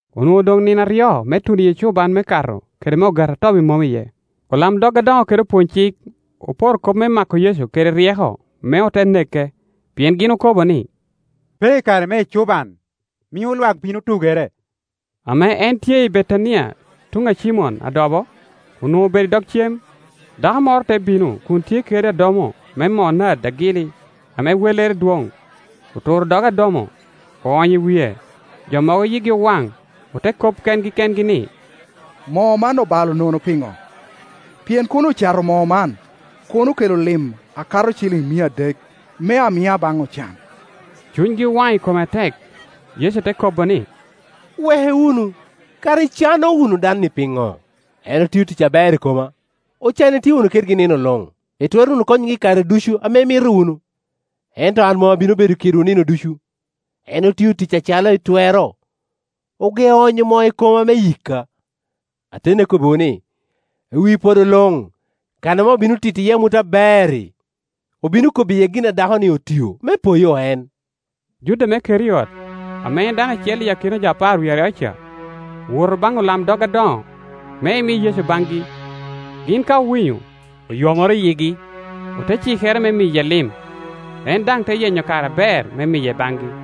Onwoŋo odoŋ nino aryo me tuno i ecuban me Kato kede me Ogati a Tobi Mom iye. Olamdog adoŋo kede opwony-cik oporo kop me mako Yecu kede ryeko, me ote neke. Pien gin okobo ni, “Pe i kare me ecuban, mio lwak bino tugere.” Ame en tye i Betania tuŋ a Cimon adobo, onwoŋo obedo i dog cem; dako moro te bino kun tye kede adomo me moo nard agili ame wellere dwoŋ. Oturo dog adomo, oonyo i wie. Jo mogo yigi owaŋ, ote kop kengi kengi ni, “Moo man obalo nono piŋo? Pien kono ocato moo man, kono okelo lim a kato ciliŋ mia adek, me amia baŋ ocan.” Cunygi owaŋ i kome atek. Yecu te kobo ni, “Weke wunu; kara icano wunu dan-ni piŋo? En otio tic aber i koma. Ocan itye wunu kedgi nino luŋ, itwero wunu konyogi i kare ducu ame imito wunu; ento an mom abino bedo kedwu nino ducu. En otio tic acalo etwero; ogeo onyo moo i koma me yika. Ateni akobbiwu ni, i wi podo luŋ kan ame obino tito iye amut aber-ri, obino kobo iye gin a dakoni otio, me poyo en.” Juda me Keriot, ame en dano acel i akina jo apar wie aryo ca, owoto baŋ olamdog adoŋo, me emi Yecu baŋgi Gin ka owinyo, oyomoro yigi, ote cikere me miye lim; en daŋ te yenyo kare aber me miye baŋgi.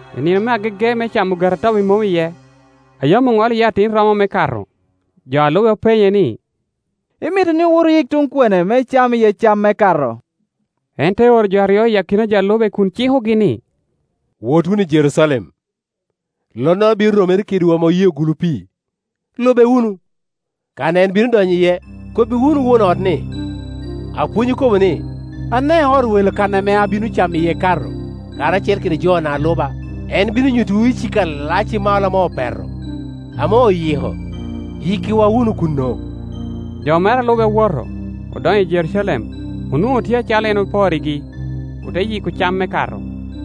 I nino me agege me camo Ogati a Tobi Mom iye, a yam oŋolo iye atin romo me Kato, jo a lube openye ni, “Imito ni owot oyik tuŋ kwene me icam iye cam me Kato?” En te oro jo aryo i akina jo a lube kun cikogi ni, “Wot wunu i Jerucalem; lonnoro bino romere kedwu ame oyeo gulu pii; lube wunu. Kan a en bino donyo iye, kobbi wunu won ot ni, ‘Apwony okobo ni, Ane ot welo kan ame abino camo iye Kato, karacel kede jona a luba?’ En bino nyuttiwu icika alac i malo ame opeto, ame oyiko; yikkiwa wunu kuno.” Jo mere a lube owoto, odonyo i Jerucalem, onwoŋo tye acalo en oporrigi, ote yiko cam me Kato.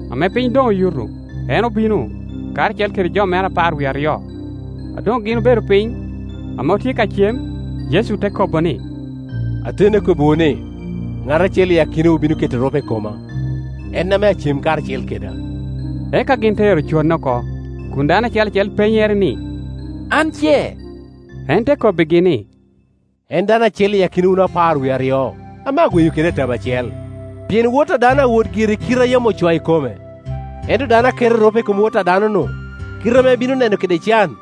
Ame piny doŋ oyuto, en obino, karacel kede jo mere apar wie aryo. A doŋ gin obedo piny, ame otye ka cem, Yecu te kobo ni, “Ateni akobbiwu ni, ŋat acel i akinawu bino keto erupe i koma, en ame acem karacel keda.” Eka gin te ero conne oko, kun dano acel acel penyere ni, “An ce?” En te kobbigi ni, “En dano acel i akina wun apar wie aryo, ame agweyo keda i tabo acel. Pien Wot a dano awot gire i kite a yam ocoo i kome; ento dano a keto erupe i kom Wot a adanonu, kite ame ebino neno kede can!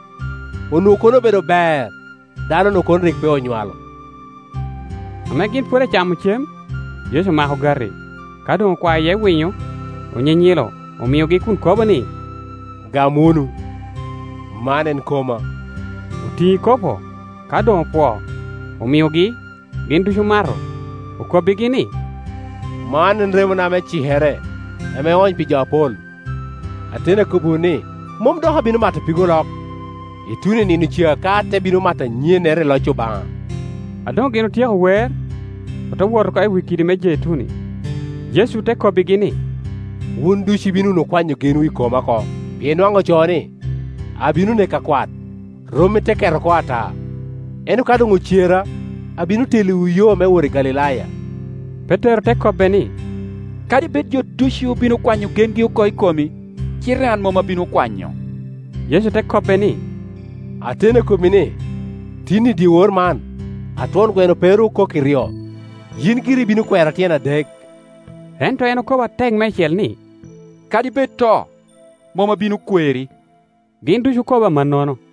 Onwoŋo kono obedo ber, dano-nu kono rik pe onywalo.” Ame gin pwod acamo cem, Yecu omako ogati; ka doŋ okwao iye winyo, onyinyilo, omiogi kun kobo ni, “Gam wunu; man en koma.” Otiŋo ikopo; ka doŋ opwoo, omiogi, gin ducu omato. Okobbigi ni, “Man en remona me cikere, ame oony pi jo apol. Ateni akobbiwu ni, mom dok abino mato pig olok, ituno i nino ca ka ate bino mato anyennere i loc Obaŋa.” A doŋ gin otyeko wer, ote wot oko i wi kidi me Jeituni. Yecu te kobbigi ni, “Wun ducu ibino wunu kwanyo genwu i koma oko; pien nwaŋ ocoo ni, ‘Abino neko akwat, rommi te ket oko ata,’ Ento ka doŋ ocera, abino telliwu yo me wot i Galilaya.” Petero te kobbe ni, “Kadi bed jo ducu bino kwanyo gengi oko i komi, cite an mom abino kwanyo.” Yecu te kobbe ni, “Ateni akobbi ni, tin, i dyewor man, a twon gweno pe ru okok iryo, yin giri ibino kwera tyen adek.” Ento en okobo atek meicel ni, “Kadi bed to, mom abino kweri.” Gin ducu okobo amannono.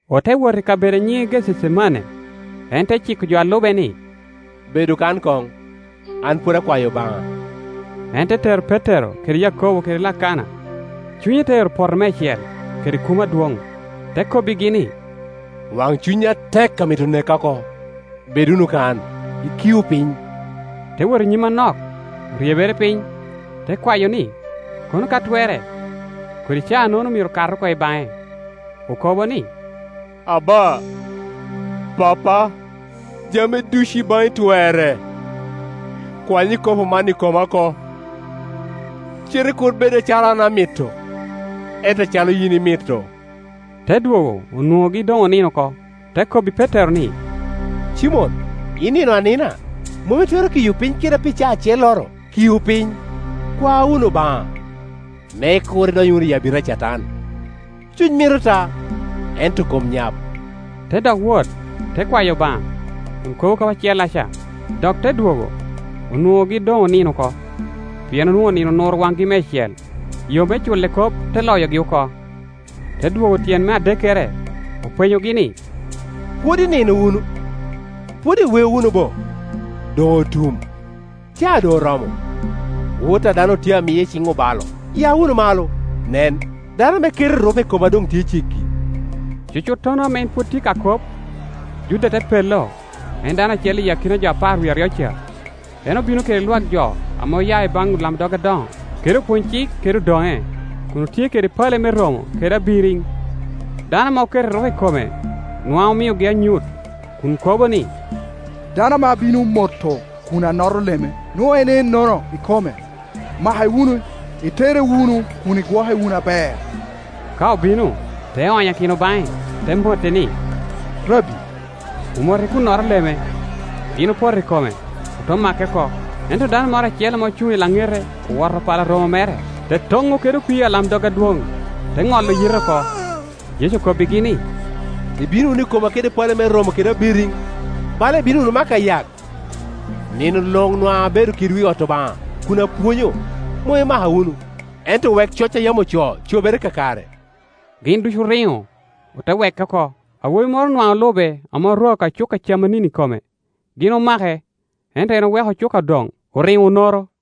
Ote wot i kabedo a nyiŋe Gececemane, en te ciko jo a lube ni, “Bedu kan koŋ, an pwod akwayo Obaŋa.” En te tero Petero kede Yakobo kede Lakana, cunye te ero poto meicel kede kumo adwoŋ. Te kobbigi ni, “Waŋcuny atek amito neka oko. Bed wunu kan, ikiu piny.” Te wot i nyim anok, oryebere piny, te kwayo ni, kono ka twerre, kodi caa-nono myero kat oko i baŋe. Okobo ni, “Aba, Pappa, jami ducu i baŋi twerre; kwany ikopo man i koma oko; cite kur bed acalo an amito, ento acalo yin imito.” Te dwogo onwoŋogi doŋ onino oko, te kobbi Petero ni, “Cimon, inino anina? Mom itwero kiyo piny keda pi caa acelloro? Kiu piny, kwa wunu Obaŋa, me kur idony wunu i abita a Catan. Cuny mito ta, ento kom nyap.” Te dok wot, te kwayo Obaŋa, kun kobo kop acellaca. Dok te dwogo, onwoŋogi doŋ onino oko, pien onwoŋo nino onuro waŋgi meicel; yo me culle kop te loyogi oko. Te dwogo tyen me adekkere, openyogi ni, “Pwod inino wunu? Pwod iweo wunu bo? Doŋ otum. Caa doŋ oromo; Wot a dano otye a miye i ciŋ obalo. Ya wunu malo; nen, dano ame keto erupe i koma doŋ tye ceggi.” Cucuttono ame en pwod tye ka kop, Juda te pello, en dano acel i akina jo apar wie aryo ca. En obino kede lwak jo ame oya i baŋ olamdog adoŋo kede opwony-cik kede odoŋe, kun otye kede pale me romo kede abiriŋ. Dano ame oketo erupe i kome nwaŋ omiogi anyut, kun kobo ni, “Dano ame abino moto kun anoto leme, nwoŋo en ennono ikome; make wunu, itere wunu kun igwoke wunu aber.” Ka obino, te onyakino baŋe, te mote ni, “Rabbi”, omote kun noto leme. Gin opoto i kome, ote make oko. Ento dano moro acel ame ocuŋ i laŋete owoto pala romo mere, te toŋo kede opii alamdog adwoŋ, te ŋolo yite oko. Yecu okobbigi ni, “Ibino wunu i koma kede pale me romo kede abiriŋ, bala ibino wunu mako ayak? Nino luŋ nwaŋ abedo kedwu i ot Obaŋa kun apwonyo, mom imaka wunu. Ento wek coc a yam ocoo cobere kakare.” Gin ducu oriŋo, ote weke oko. Awobi moro nwaŋ olube ame orwao ka cuka camanini i kome. Gin omake, ento en oweko cuka odoŋ, oriŋo onoro.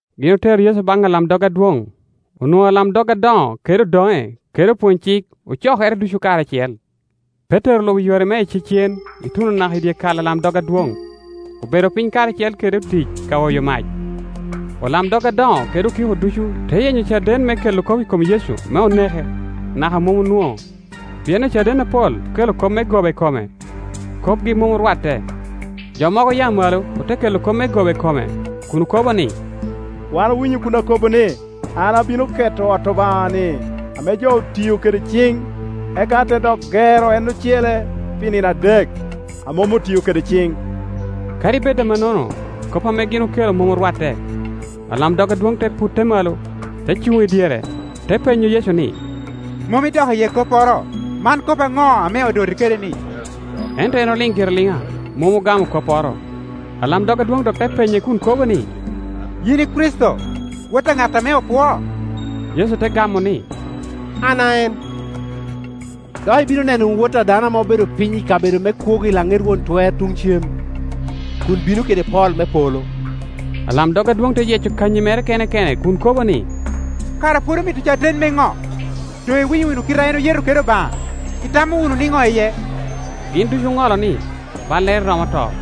Gin otero Yecu baŋ alamdog adwoŋ; onwoŋo alamdog adoŋo kede odoŋe kede opwony-cik ocokere ducu karacel. Petero olubo yore me icecen ituno naka i dyekal alamdog adwoŋ; obedo piny karacel kede otic ka oyo mac. Olamdog adoŋo kede okiko ducu te yenyo caden me kelo kop i kom Yecu me oneke, naka mom onwoŋo. Pien ocaden apol okelo kop me goba i kome, kopgi mom orwatte. Jo mogo oya malo ote kelo kop me goba i kome kun okobo ni, “Wan owinyo kun kobo ni, ‘An abino keto ot Obaŋa-ni ame jo otio kede ciŋ, eka ate dok gero en ocele pi nino adek, a mom otio kede ciŋ.’” Kadi bed amonnono, kop ame gin okelo mom orwatte. Alamdog adwoŋ te putte malo, te cuŋ i dyere, te penyo Yecu ni, “Mom idok iye kopporo? Man kop aŋo ame odoti kede-ni?” Ento en oliŋ gire aliŋa, mom ogamo kopporo. Alamdog adwoŋ dok te penye kun kobo ni, “Yin i Kricito, Wot a ŋat ame opwoo?” Yecu te gamo ni, “An a en; dok ibino neno wunu Wot a dano ame obedo piny i kabedo me kwogo i laŋet Won Twer tuŋ cem, kun bino kede pol me polo.” Alamdog adwoŋ te yeco kanyi mere kene kene kun kobo ni, “Kara pwod omito caden me ŋo? Doŋ iwinyo wunu kite a en oyeto kede Obaŋa. Itamo wunu niŋo iye?” Gin ducu oŋolo ni, ballere romo to.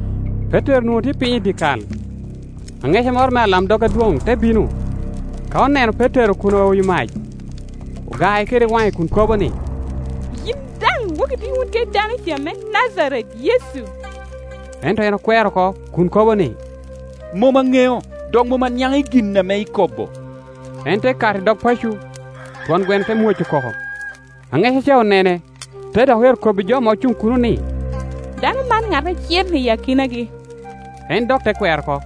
Petero onwoŋo tye piny i dyekal. Aŋeca moro mea alamdog adwoŋ te bino. Ka oneno Petero kun aoyo mac, ogae kede waŋe kun kobo ni, “Yin daŋ woki itye wun kede dano ca me Najaret, Yecu.” Ento en okwero oko, kun kobo ni, “Mom aŋeo dok mom aniaŋ i gin ame ikobo.” En te kato i dog paco, twon gweno te mwoco koko. Aŋeca ca onene, te dok ero kobbi jo ame Ocuŋ kuno ni “Dano man ŋat acel i akinagi.” En dok te kwero oko.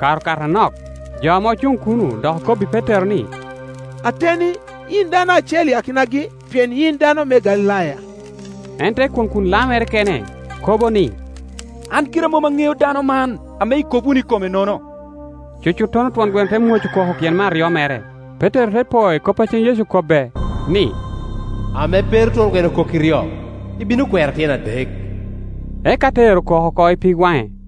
Kare okato anok, jo ame ocuŋ kuno dok okobbi Petero ni, “Ateni, yin dano acel i akinagi, pien yin dano me Galilaya.” En te kwoŋ kun lamere kene, kobo ni, “An gira mom aŋeo dano man ame ikop wunu i kome-nono.” Cucutto no twon gweno te mwoco koko tyen me aryo mere. Petero te po i kop a cen Yecu okobbe, ni, “Ame pe ru twon gweno okok iryo, ibino kwera tyen adek.” Eka te ero koko oko i pig waŋe.